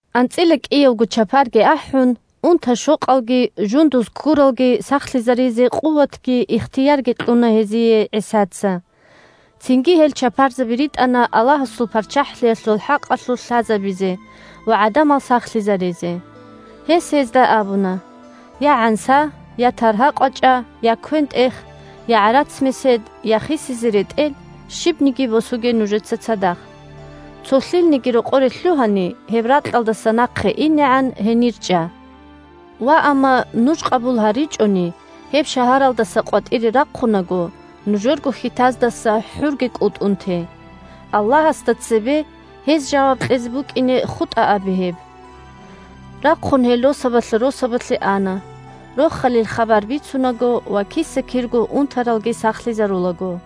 АнцӀила кӀиявго чапарги ахӀун, унта-щокъалги жундуз ккуралги сахлъизаризе къуватги ихтиярги кьуна гьезие ГӀисаца. Цинги гьел чапарзаби ритӀана Аллагьасул ПарччахӀлъиялъул хӀакъалъулъ лъазабизе ва гӀадамал сахлъизаризе. Гьес гьезда абуна: – Я гӀанса, я таргьа-къвачӀа, я квен-тӀех, я гӀарац-месед, я хисизе ретӀел – щибниги босуге нужеца цадахъ. Цо лъилниги рокъоре лъугьани, гьеб ракьалдаса нахъе инегӀан, гьенир чӀа. Ваамма нуж къабул гьаричӀони, гьеб шагьаралдаса къватӀире рахъунаго, нужерго хьитаздаса хӀурги кӀутӀун те. Аллагьасда цебе гьез жаваб кьезе букӀине хутӀа абе гьеб. Рахъун гьел росабалъа росабалъе ана, Рохалил хабар бицунаго ва киса-кирго унтаралги сахлъизарулаго.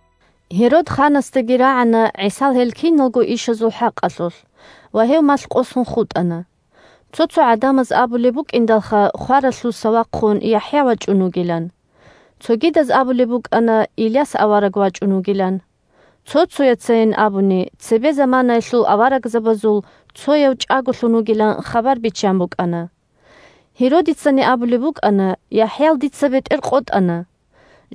Гьерод ханасдаги рагӀана ГӀисал гьел киналго ишазул хӀакъалъулъ, ва гьев малъкъосун хутӀана. Цо-цо гӀадамаз абулеб букӀиндалха хваралъуса вахъун ЯхӀя вачӀун вугилан. Цогидаз абулеб букӀана Иляс авараг вачӀун вугилан, цо-цояцайин абуни, цебе заманаялъул аварагзабазул цояв чӀаголъун вугилан хабар биччан букӀана. Гьеродицани абулеб букӀана: – ЯхӀял дица бетӀер къотӀана;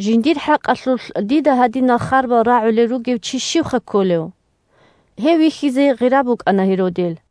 жиндир хӀакъалъулъ дида гьадинал харбал рагӀулел ругев чи щивха кколев? Гьев вихьизе гъира букӀана Гьеродил.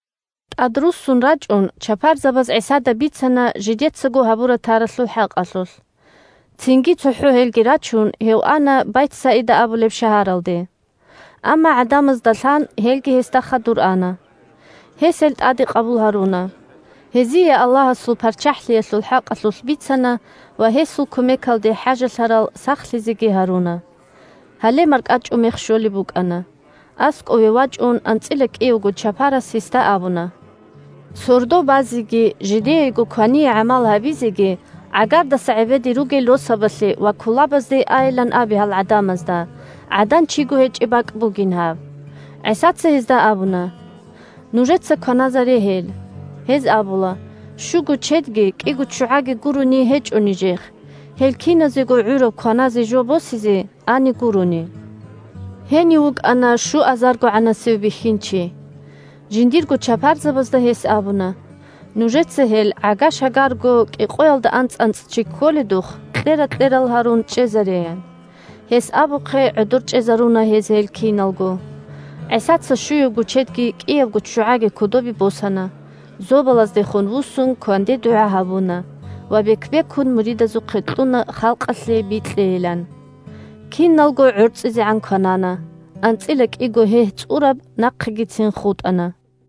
ТӀадруссун рачӀун чапарзабаз ГӀисада бицана жидецаго гьабура-таралъул хӀакъалъулъ. Цинги, цохӀо гьелги рачун, гьев ана Байтсаида абулеб шагьаралде. Амма, гӀадамазда лъан, гьелги гьесда хадур ана. Гьес гьел тӀаде къабул гьаруна. Гьезие Аллагьасул ПарччахӀлъиялъул хӀакъалъулъ бицана ва гьесул кумекалде хӀажалъарал сахлъизеги гьаруна. Гьале маркӀачӀумех щолеб букӀана. АскӀове вачӀун анцӀила кӀиявго чапарас гьесда абуна: – Сордо базеги жидеего квание гӀамал гьабизеги гӀагардаса гӀебеде ругел росабалъе ва кулабазде айилан абе гьал гӀадамазда, гӀадан-чиго гьечӀеб бакӀ бугин гьаб. ГӀисаца гьезда абуна: – Нужеца кваназаре гьел. Гьез абула: – Щуго чедги кӀиго ччугӀаги гурони гьечӀо нижехъ, гьел киназего гӀураб кваназе жо босизе ани гурони. (Гьенив вукӀана щуазаргогӀанасев бихьинчи.) Жиндирго чапарзабазда гьес абуна: – Нужеца гьел, гӀага-шагарго кӀикъоялда анцӀ-анцӀ чи кколедухъ, кьера-кьерал гьарун чӀезаре, – ян. Гьес абухъе гӀодор чӀезаруна гьез гьел киналго. ГӀисаца щуябго чедги кӀиябго ччугӀаги кодобе босана, зобалаздехун вуссун кванде дугӀа гьабуна ва бек-бекун муридазухъе кьуна халкъалъе бикьейилан. Киналго гӀорцӀизегӀан кванана, анцӀила кӀиго гьегь цӀураб нахъегицин хутӀана.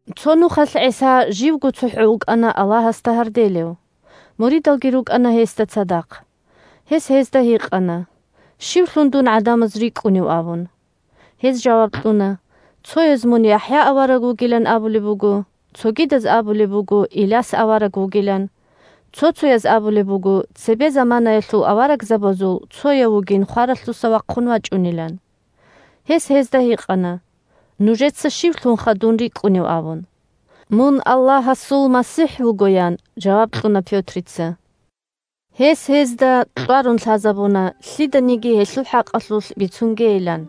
Цо нухалъ ГӀиса живго цохӀо вукӀана Аллагьасда гьарделев. Муридалги рукӀана гьесда цадахъ. Гьес гьезда гьикъана: – Щивлъун дун гӀадамаз рикӀкӀунев? – абун. Гьез жаваб кьуна: – Цояз мун ЯхӀя авараг вугилан абулеб буго, цогидаз абулеб буго Иляс авараг вугилан, цо-цояз абулеб буго цебе заманаялъул аварагзабазул цояв вугин хваралъуса вахъун вачӀунилан. Гьес гьезда гьикъана: – Нужеца щивлъунха дун рикӀкӀунев? – абун. – Мун Аллагьасул МасихӀ вуго, – ян жаваб кьуна Пётрица. Гьес гьезда кьварун лъазабуна лъиданиги гьелъул хӀакъалъулъ бицунгейилан.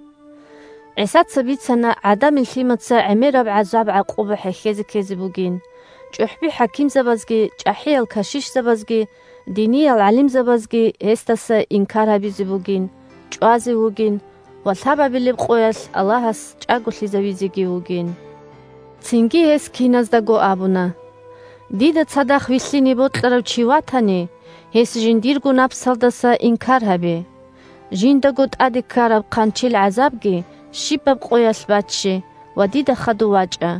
ГӀисаца бицана ГӀадамил Лъимаца гӀемераб гӀазаб-гӀакъуба хӀехьезе ккезе бугин, чӀухӀби-хӀакимзабазги, чӀахӀиял кашишзабазги, диниял гӀалимзабазги гьесдаса инкар гьабизе бугин, чӀвазе вугин ва лъабабилеб къоялъ Аллагьас чӀаголъизавизеги вугин. Цинги гьес киназдаго абуна: – Дида цадахъ вилълъине бокьарав чи ватани, гьес жиндирго напсалдаса инкар гьабе, жиндаго тӀаде ккараб хъанчил гӀазабги щибаб къоялъ бачче ва дида хадув вачӀа.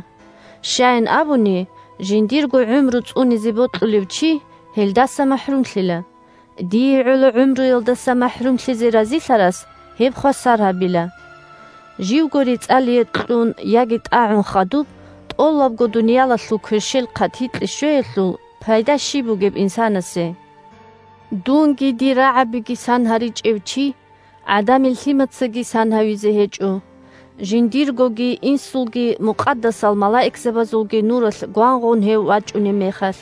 Щаян абуни, жиндирго гӀумру цӀунизе бокьулев чи гьелдаса махӀрумлъила, дие гӀоло гӀумруялдаса махӀрумлъизе разилъарас гьеб хвасар гьабила. Живго рецӀалие кьун яги тӀагӀун хадуб, тӀолабго дуниялалъул кверщел хъатикье щвеялъул щиб пайда бугеб инсанасе? Дунги дир рагӀабиги сан гьаричӀев чи ГӀадамил Лъимацаги сан гьавизе гьечӀо, жиндиргоги, Инсулги, мукъадасал малаикзабазулги нуралъ гвангъун гьев вачӀунеб мехалъ.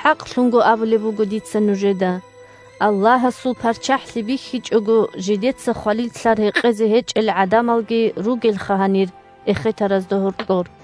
ХӀакълъун абулеб буго дица нужеда: Аллагьасул ПарччахӀлъи бихьичӀого жидеца хвалил лълъар гьекъезе гьечӀел гӀадамалги ругелха гьанир эхетаразда гьоркьор.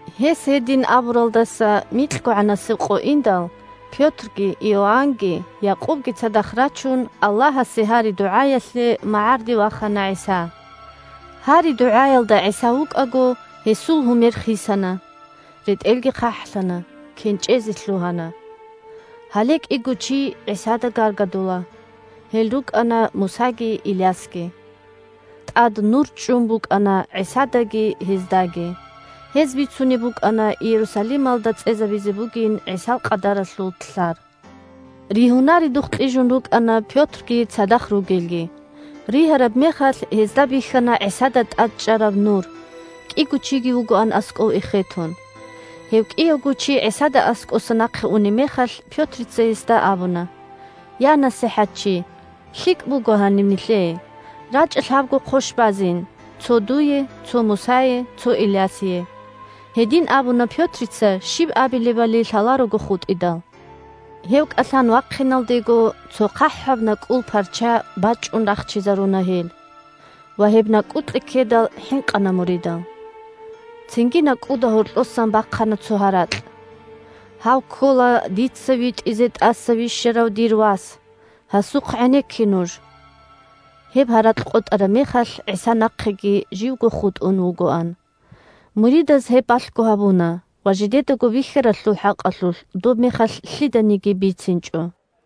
Гьес гьедин абуралдаса микьгогӀанасеб къо индал, Пётрги, Иоаннги, Якъубги цадахъ рачун, Аллагьасе гьари-дугӀаялъе магӀарде вахана ГӀиса. Гьари-дугӀаялда ГӀиса вукӀаго, гьесул гьурмал куц хисана, ретӀелги хъахӀлъана, кенчӀезе лъугьана. Гьале кӀиго чи ГӀисада гаргадула. Гьел рукӀана Мусаги Илясги. ТӀад нур чӀун букӀана ГӀисадаги гьездаги. Гьез бицунеб букӀана Иерусалималда цӀезабизе бугин ГӀисал къадаралъул лълъар. Ригьунаредухъ кьижун рукӀана Пётрги цадахъ ругелги. Ригьараб мехалъ гьезда бихьана ГӀисада тӀад чӀараб нур, кӀиго чиги вугоан аскӀов эхетун. Гьев кӀиявго чи ГӀисада аскӀоса нахъе унеб мехалъ, Пётрица гьесда абуна: – Я, НасихӀатчи! ЛъикӀ буго гьаниб нилъее. РачӀа лъабго хъощ базин: цо дуе, цо Мусае, цо Илясие. (Гьедин абуна Пётрица щиб абилебали лъаларого хутӀидал.) Гьев кӀалъан вахъиналдего, цо хъахӀаб накӀкӀул парча бачӀун рахчизаруна гьел, ва, гьеб накӀкӀукье ккедал, хӀинкъана муридал. Цинги накӀкӀуда гьоркьосан бахъана цо гьаракь: – Гьав ккола дица витӀизе тӀаса вищарав дир Вас. Гьасухъ гӀенекке нуж! Гьеб гьаракь къотӀараб мехалъ, ГӀиса нахъеги живго хутӀун вугоан. Муридаз гьеб балъго гьабуна ва жидедаго бихьаралъул хӀакъалъулъ доб мехалъ лъиданиги бицинчӀо.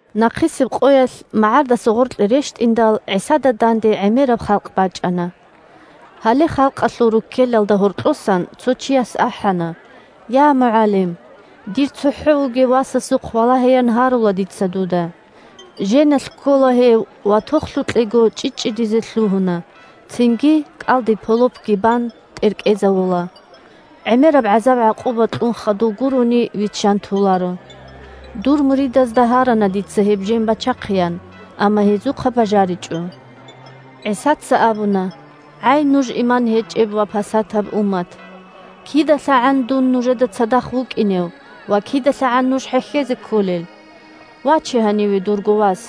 Нахъисеб къоялъ, магӀардаса гъоркье рещтӀиндал, ГӀисада данде гӀемераб халкъ бачӀана. Гьале халкъалъул руккелалда гьоркьосан цо чияс ахӀана: – Я, МугӀалим! Дир цохӀо вугев васасухъ валагьеян гьарула дица дуда. Женалъ ккола гьев ва тохлъукьего чӀчӀичӀчӀидизе лъугьуна, цинги, кӀалдиб полопги бан, тӀеркӀезавула. ГӀемераб гӀазаб-гӀакъуба кьун хадув гурони виччан толаро. Дур муридазда гьарана дица гьеб жен бачахъеян, амма гьезухъа бажаричӀо. ГӀисаца абуна: – ГӀай, нуж иман гьечӀеб ва пасатаб уммат! КидалъагӀан дун нужеда цадахъ вукӀинев ва кидалъагӀан нуж хӀехьезе кколел? Ваче гьаниве дурго вас.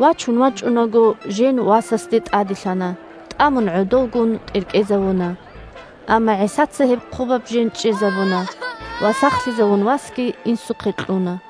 Вачун вачӀунаго, жен васасде тӀаделъана, тӀамун гӀодовгун, тӀеркӀезавуна. Амма ГӀисаца гьеб хъубаб жен чӀезабуна ва сахлъизавун васги инсухъе кьуна.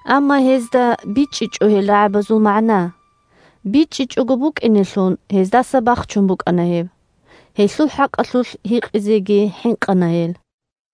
Амма гьезда бичӀчӀичӀо гьел рагӀабазул магӀна. БичӀчӀичӀого букӀинелъун, гьездаса бахчун букӀана гьеб. Гьелъул хӀакъалъулъ гьикъизеги хӀинкъана гьел. «Бищун кӀудияв щив?»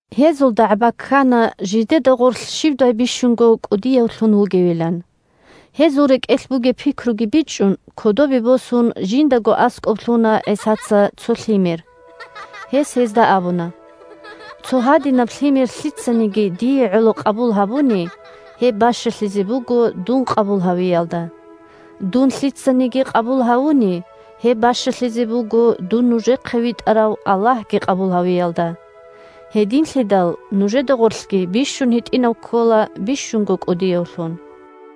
Гьезул дагӀба ккана жидеда гъорлъ щивдай бищунго кӀудиявлъун вугевилан. Гьезул рекӀелъ бугеб пикруги бичӀчӀун, кодобе босун, жиндаго аскӀоб лъуна ГӀисаца цо лъимер. Гьес гьезда абуна: – Цо гьадинаб лъимер лъицаниги, дие гӀоло, къабул гьабуни, гьеб бащалъизе буго дун къабул гьавиялда. Дун лъицаниги къабул гьавуни, гьеб бащалъизе буго дун нужехъе витӀарав Аллагьги къабул гьавиялда. Гьединлъидал нужеда гъорлъги бищунго гьитӀинав ккола бищунго кӀудиявлъун. «Нужеда дандечӀоларев чи ккола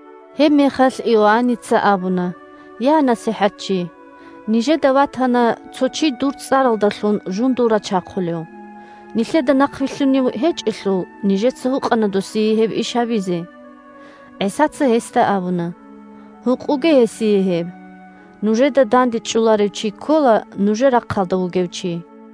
нужер рахъалда вугев чи» Гьебмехалъ Иоанница абуна: – Я, НасихӀатчи! Нижеда ватана цо чи дур цӀаралдалъун жундул рачахъулев. Нилъеда нахъвилълъунев гьечӀелъул, нижеца гьукъана досие гьеб иш гьабизе. ГӀисаца гьесда абуна: – Гьукъуге гьесие гьеб. Нужеда дандечӀоларев чи ккола нужер рахъалда вугев чи.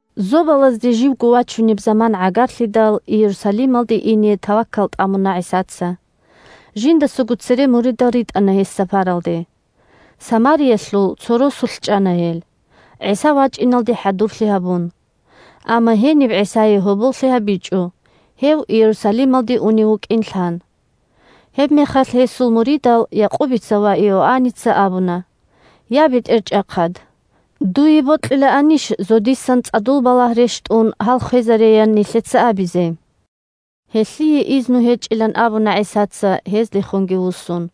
Зобалазде живго вачунеб заман гӀагарлъидал, Иерусалималде ине таваккал тӀамуна ГӀисаца. Жиндасаго цере муридал ритӀана гьес сапаралде. Самариялъул цо росулъ чӀана гьел, ГӀиса вачӀиналде хӀадурлъи гьабун. Амма гьениб ГӀисае гьоболлъи гьабичӀо, гьев Иерусалималде унев вукӀин лъан. Гьебмехалъ гьесул муридал Якъубица ва Иоанница абуна: – Я, БетӀерчӀахъад! Дуе бокьилаанищ зодисан цӀадул балагь рещтӀун гьал хвезареян нилъеца абизе. Гьелъие изну гьечӀилан абуна ГӀисаца, гьездехунги вуссун.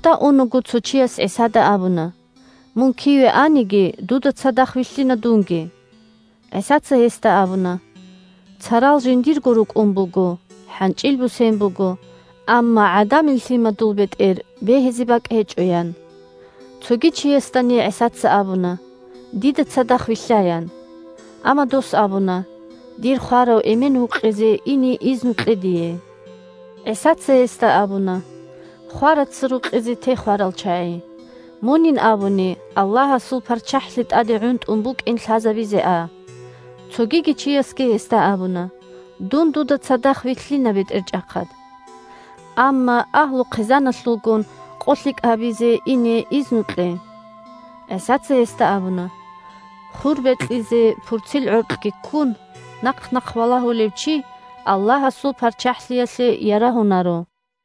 Нухда унаго цо чияс ГӀисада абуна: – Мун киве аниги, дуда цадахъ вилълъина дунги. ГӀисаца гьесда абуна: – Царал жиндирго рукӀун буго, хӀанчӀил бусен буго, амма ГӀадамил Лъимадул бетӀер бегьизе бакӀ гьечӀо, – ян. Цоги чиясдани ГӀисаца абуна: – Дида цадахъ вилълъа, – ян. Амма дос абуна: – Дир хварав эмен вукъизе ине изну кье дие. ГӀисаца гьесда абуна: – Хвараца рукъизе те хварал чагӀи. Мунин абуни Аллагьасул ПарччахӀлъи тӀаде гӀунтӀун букӀин лъазабизе а. Цогиги чиясги гьесда абуна: – Дун дуда цадахъ вилълъина, БетӀерчӀахъад! Амма агьлу-хъизаналъулгун къолъикӀ гьабизе ине изну кье. ГӀисаца гьесда абуна: – Хур бекьизе пурцил гӀоркьги ккун, нахъ-нахъ валагьулев чи Аллагьасул ПарччахӀлъиялъе ярагьунаро.